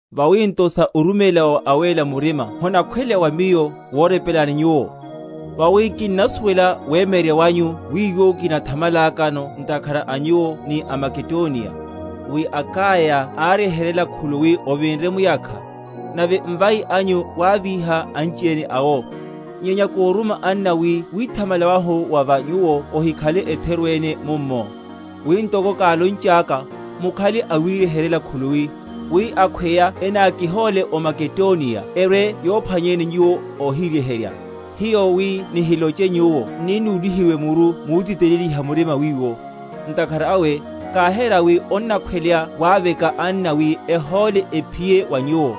Vawi nto sa oruméla wa wa awéle murima honakhweleya wa miyo worepelani nyuwo; vawi kinnasuwela wemyeryerya wanyu wiwo kinithamala?-?kano ntakhara a nyuwo ni aMakedoniya, wi Akaya áryeheryela khuluwi ovinre muyakha; nave mvai anyu wávíha anchiene awo. Nyenya kóruma anna wi withamala wahu wa va nyuwo ohikhale etheru ene mummo; wi, ntoko kálonchaka, mukhale awiryeheryela khuluwi; wi akhweya enakihóle ó Makedoniya erwe‐yophwanyeni nyuwo óhiryeherya, hiyo (wi nihiloche nyuwo) n’ni núlihiwe muru mutiteleliha murima wiwo. Ntakhara awe káhera wi onnakhweleya waveka anna wi ehóle ephiye wa nyuwo,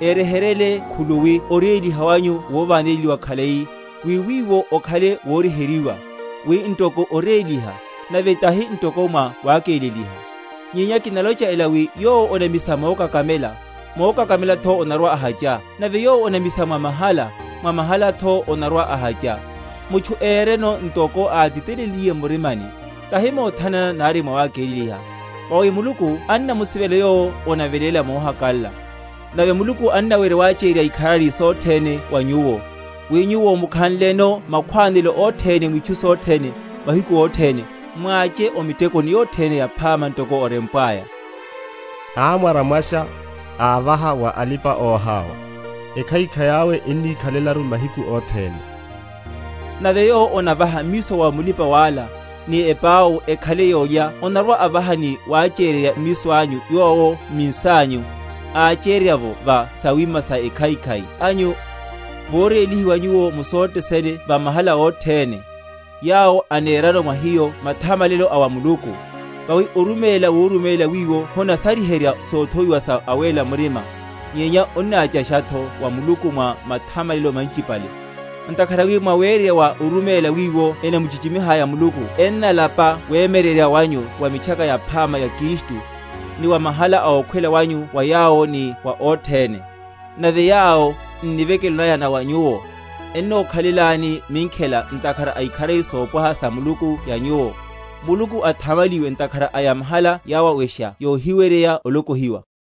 eryeheryele khuluwi oréliha wanyu wováneliwa khalai, wi wiwo okhale woryeheryiwa, wi ntoko oréliha, nave tahi ntoko mwa wákeleliha. Nyenya kinalocha ela, wi yowo onamisa mokakamela, mokakamelatho onarwa‐ahacha. Nave yowo onamisa mwa mahala, mwa mahalatho onarwa‐ahacha. Mutchu éreno ntoko átitelenliye m’murimani, tahi mothanana nari mwawakeleliha, vawi Muluku annamusivela yowo onaveléla mohakalala. Nave Muluku annawerya wachéryerya ikharari sothene wa nyuwo; wi nyuwo, mukhanleno makhwánelo othene mwitchu sothene, mahiku othene, mwáche o mitekoni yothene yaphama; ntoko orempwaya; Amwaramwasha; ávaha wa alipa‐oháwa; Ekhaikhai awe ennikhalelaru mahiku othene. Nave yowo onavaha mmiso wa mulipa‐wala, ni epau ekhale yólya, onarwa‐avaha ni wachéryerya mmiso anyu yowo m’minsanyu, ácheryerya’vo va sawima sekhaikhai anyu; Vorélihiwa nyuwo mu sothe sene wa mahala othene, yawo anerano mwa hiyo mathamalelo a wa Muluku. Vawi oruméla woruméla wiwo honasaryiherya sothowiwa sa awéla murimaru, nyenya onnáchashatho wa Muluku mwa mathamalelo manchipale; Ntakhara wi mwawererya wa oruméla wiwo ennamuchichimiha Muluku enalapaya wemyeryerya wanyu wa Mitchaka Yaphama ya Kristu, ni wa mahala a okawela wanyu wa yawo ni wa othene; nave yawo, n’nivekelo naya na wa nyuwo, ennokhalelani minkhela, ntakhara a ikharari sopwaha sa Muluku ya nyuwo. Muluku athamaliwe ntakhara a yamahala yawawesha yohiweryeya olokohiwa.